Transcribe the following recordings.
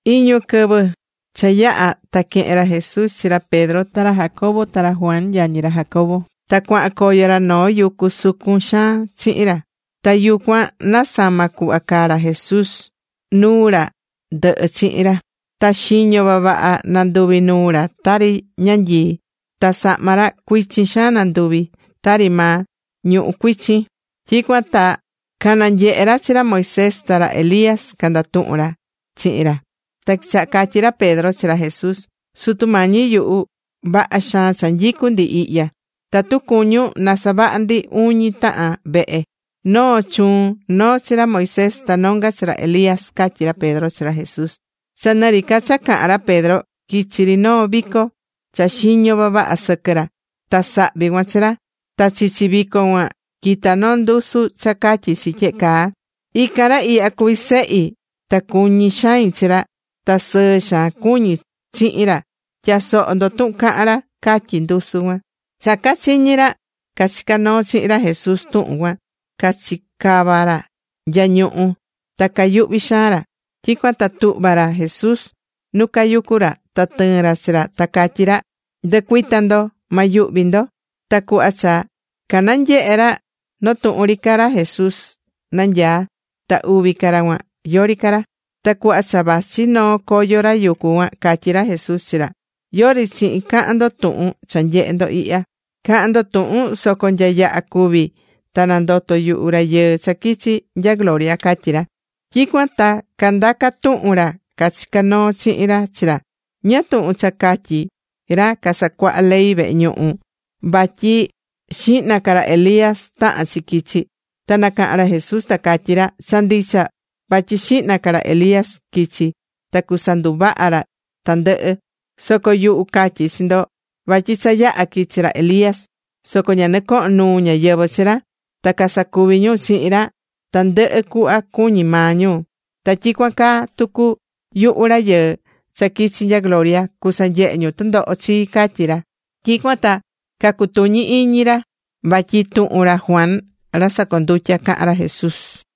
Iñu quɨvɨ cha yaha̱, ta quehe̱n ra Jesús chi ra Pedro ta ra Jacobo, ta ra Juan yañi ra Jacobo. Ta cuahan coyo ra noo yucu sucun xaan chihin ra. Ta yucuan nasama̱ cuhva caa ra Jesús nuu ra ndɨhɨ chihin ra. Ta xiño vavaha nanduvi̱ nuu ra tari ñanyii. Ta sahma ra cuichin xaan nanduvi̱ tari maa ñuhú cuichin. Tyicuan ta cananyehe̱ ra chi ra Moisés ta ra Elías, candatuhún ra chihin ra. Ta quichaha̱ catyí ra Pedro chi ra Jesús: ―Sutu Mañi yuhu, vaha xaan cha nyicú ndi ihya. Tatu cuñún na savaha ndi uñi tahan vehe. Noo chuun, noo chi ra Moisés, ta nonga chi ra Elías ―catyí ra Pedro chi ra Jesús. Cha nɨ ri ca cha cahán ra Pedro, quichi̱ ri noo vico cha xiño vavaha sɨquɨ ra. Ta sahvi cuan chi ra. Ta chichi vico cuan quita̱ noo ndusu cha catyí chi tyehe caa: ―Ican ra ihya cuví Sehi, ta cuñí xain chi ra. Ta sɨɨ xaan cuñí chihin ra. Tya̱soho ndo tuhun cahán ra ―catyí ndusu cuan. Cha cachiñi̱ ra cachicá noo chihin ra Jesús tuhun cuan, cachicava̱ ra nya ñuhu, ta cayuhvi̱ xaan ra. Tyicuan ta tuhva̱ ra Jesús nu cayucú ra, ta tɨɨ̱n ra chi ra, ta catyí ra: ―Ndɨ̱cuita ndo. Ma yuhvi ndo. Ta cuhva cha cananyehe̱ ra, noo tuhun ri ca ra Jesús nanyaá, ta uvi ca ra cuan, yori ca ra. Ta cuhva cha vachi noo coyo ra yucu cuan, catyí ra Jesús chi ra: ―Yori chihin ca̱han ndo tuhun cha nyehe̱ ndo ihya. Ca̱han ndo tuhun soco nya yaha cúvi ta nandoto yuhu Rayɨɨ cha quichi̱ nya gloria ―catyí ra. Tyicuan ta candaca̱ tuhun ra cachicá noo chihin ra chi ra, ―¿Ñáá tuhun cha catyí ra casacuahá ley vehe ñuhu vatyi xihna ca ra Elías tahán chi quichi? Ta nacaha̱n ra Jesús ta catyí ra: ―Cha ndicha vatyi xihna ca ra Elías quichi ta cusanduvaha ra tandɨhɨ. Soco yuhu catyí chi ndo vatyi cha yaha̱ quichi̱ ra Elías, soco ña nɨcoho̱n nuu ñáyɨvɨ chi ra, ta casacuvi̱ ñu chihin ra tandɨhɨ cuhva cuñi̱ maa ñu. Ta tyicuan caa tucu yuhu Rayɨɨ cha quichi̱ nya gloria, cusanyehe ñu tɨndoho chii ―catyí ra. Tyicuan ta cacutuñi̱ iñi ra vatyi tuhun ra Juan ra sacondutya cahán ra Jesús.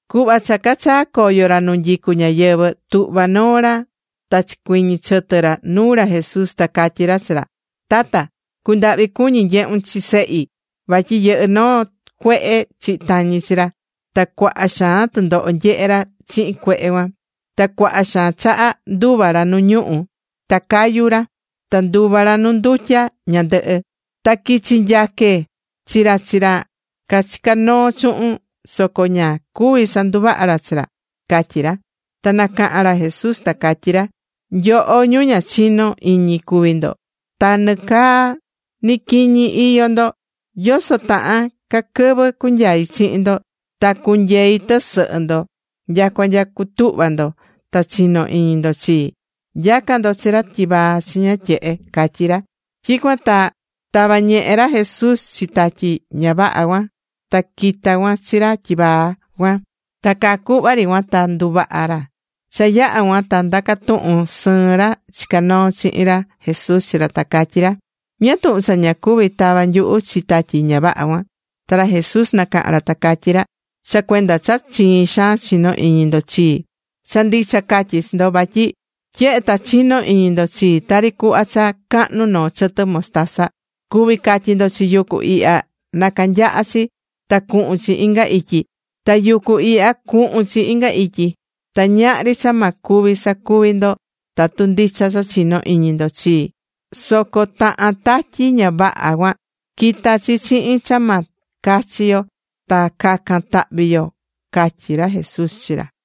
Cuhva cha cachaa̱ coyo ra nu nyicú ñáyɨvɨ, tuhva noo ra ta chicuiñi chɨtɨ ra nuu ra Jesús, ta catyí ra chi ra: ―Tata, cu̱ndahvi cuñi nyehun chi sehi, vatyi yɨhɨ́ noo cuehe chihi tañi chi ra, ta cuaha xaan tɨndoho nyehé ra chihin cuehe cuan. Ta cuaha xaan chaha nduva̱ ra nu ñuhu̱ ta cayu̱ ra, ta nduva̱ ra nu ndutya ñandɨhɨ. Ta quichi̱ nyaque chi ra chi ra cachicá noo chuhun, soco ña cuvi̱ sanduvaha̱ ra chi ra ―catyí ra. Ta nacaha̱n ra Jesús ta catyí ra: ―¡Nyoho, ñu ña chinó iñi cuví ndo! ¡Ta nɨcaa ni quiñi iyó ndo! ¿Yoso tahan ca quɨvɨ cunyai chihin ndo ta cunyei tɨsɨhɨ ndo nyacua nya cutuhva ndo ta chino iñi ndo chii? Nya̱ca ndo chi ra tyivaa chiña tyehe ―catyí ra. Tyicuan ta tava̱ ñehe ra Jesús chi tatyi ña vaha cuan, ta quita̱ cuan chi ra tyivaa cuan. Ta caa cuhva ri cuan ta nduvaha̱ ra. Cha yaha̱ cuan ta ndaca̱ tuhun sɨɨn ra chicá noo chihin ra Jesús chi ra ta catyí ra: ―¿Ñáá tuhun cha ña cuvi̱ tava nyuhu chi tatyi ña vaha cuan? Ta ra Jesús nacaha̱n ra ta catyí ra: ―Cha cuenda cha chiin xaan chinó iñi ndo chii. Cha ndicha catyí chi ndo vatyi tyehe ta chinó iñi ndo chii, tari cuhva cha cahnu noo chɨtɨ mostaza, cuví catyi ndo chi yucu ihya na canyaha chi ta cuhun chi inga ityi, ta yucu ihya cuhun chi inga ityi. Ta ñahri cha ma cuvi sacuvi ndo tatu ndicha cha chinó iñi ndo chii. Soco tahan tatyi ña vaha cuan, quita chi chihin cha ma cachi yo ta cacan tahvi yo ―catyí ra Jesús chi ra.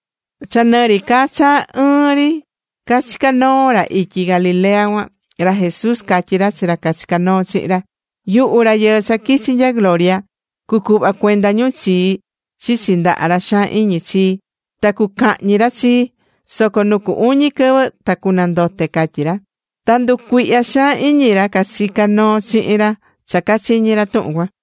Cha nɨ ri ca cha ɨɨn ri cachicá noo ra ityi Galilea cuan, ra Jesús catyí ra chi ra cachicá noo chihin ra: ―Yuhu Rayɨɨ cha quichi̱ nya gloria, cucuhva cuenda ñu chii chichi ndaha ra xaan iñi chii. Ta cucahñi ra chii. Soco nu cu uñi quɨvɨ ta cunandote ―catyí ra. Ta canducuihya xaan iñi ra cachicá noo chihin ra cha cachiñi̱ ra tuhun cuan.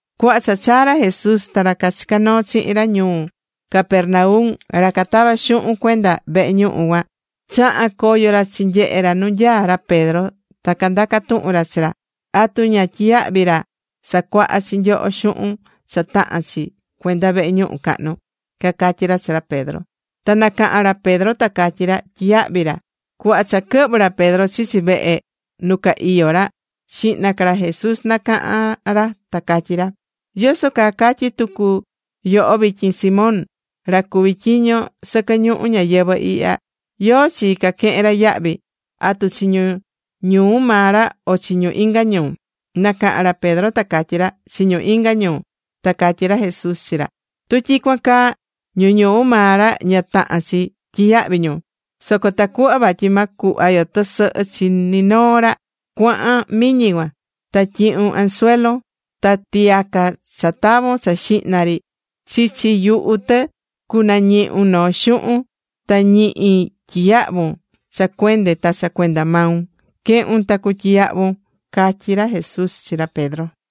Cuhva cha chaa̱ ra Jesús ta ra cachicá noo chihin ra ñuu Capernaum, ra catavá xuhun cuenda vehe ñuhu cuan, chaha̱n coyo ra chinyehe ra nu nyaá ra Pedro ta candaca̱ tuhun ra chi ra: ―¿Atu ña tyiyahví ra sacuaha chi nyoho xuhun cha tahán chi cuenda vehe ñuhu cahnu? ―cacatyí ra chi ra Pedro. Ta nacaha̱n ra Pedro ta catyí ra: ―Tyiyahví ra. Cuhva cha quɨhvɨ̱ ra Pedro chichi vehe nu ca iyó ra, xihna ca ra Jesús nacaha̱n ra ta catyí ra: ―¿Yoso caa catyi tucu yoho vityin Simón? Ra cuví tyiño sɨquɨ ñuhu ñayɨvɨ̱ ihya, ¿yóó chi caquehen ra yahvi? ¿Atu chi ñu ñuu maa ra o chi ñu inga ñuu? Nacaha̱n ra Pedro ta catyí ra: ―Chi ñu inga ñuu. Ta catyí ra Jesús chi ra: ―Tu tyicuan caa, ñu ñuu maa ra ña tahán chi tyiyahvi ñu. Soco tacuhva vatyi ma cuhva yo tɨsɨhɨ chi ni noo ra, cua̱han miñi cuan, ta tyi̱hun anzuelo, ta tiyaca cha tavon cha xihna ri, chichi yuhu tɨ cunañihun noo xuhun. Ta ñihi tyiyahvun cha cuende ta cha cuenda maun. Que̱hun ta cu̱tyiyahvun ―catyí ra Jesús chi ra Pedro.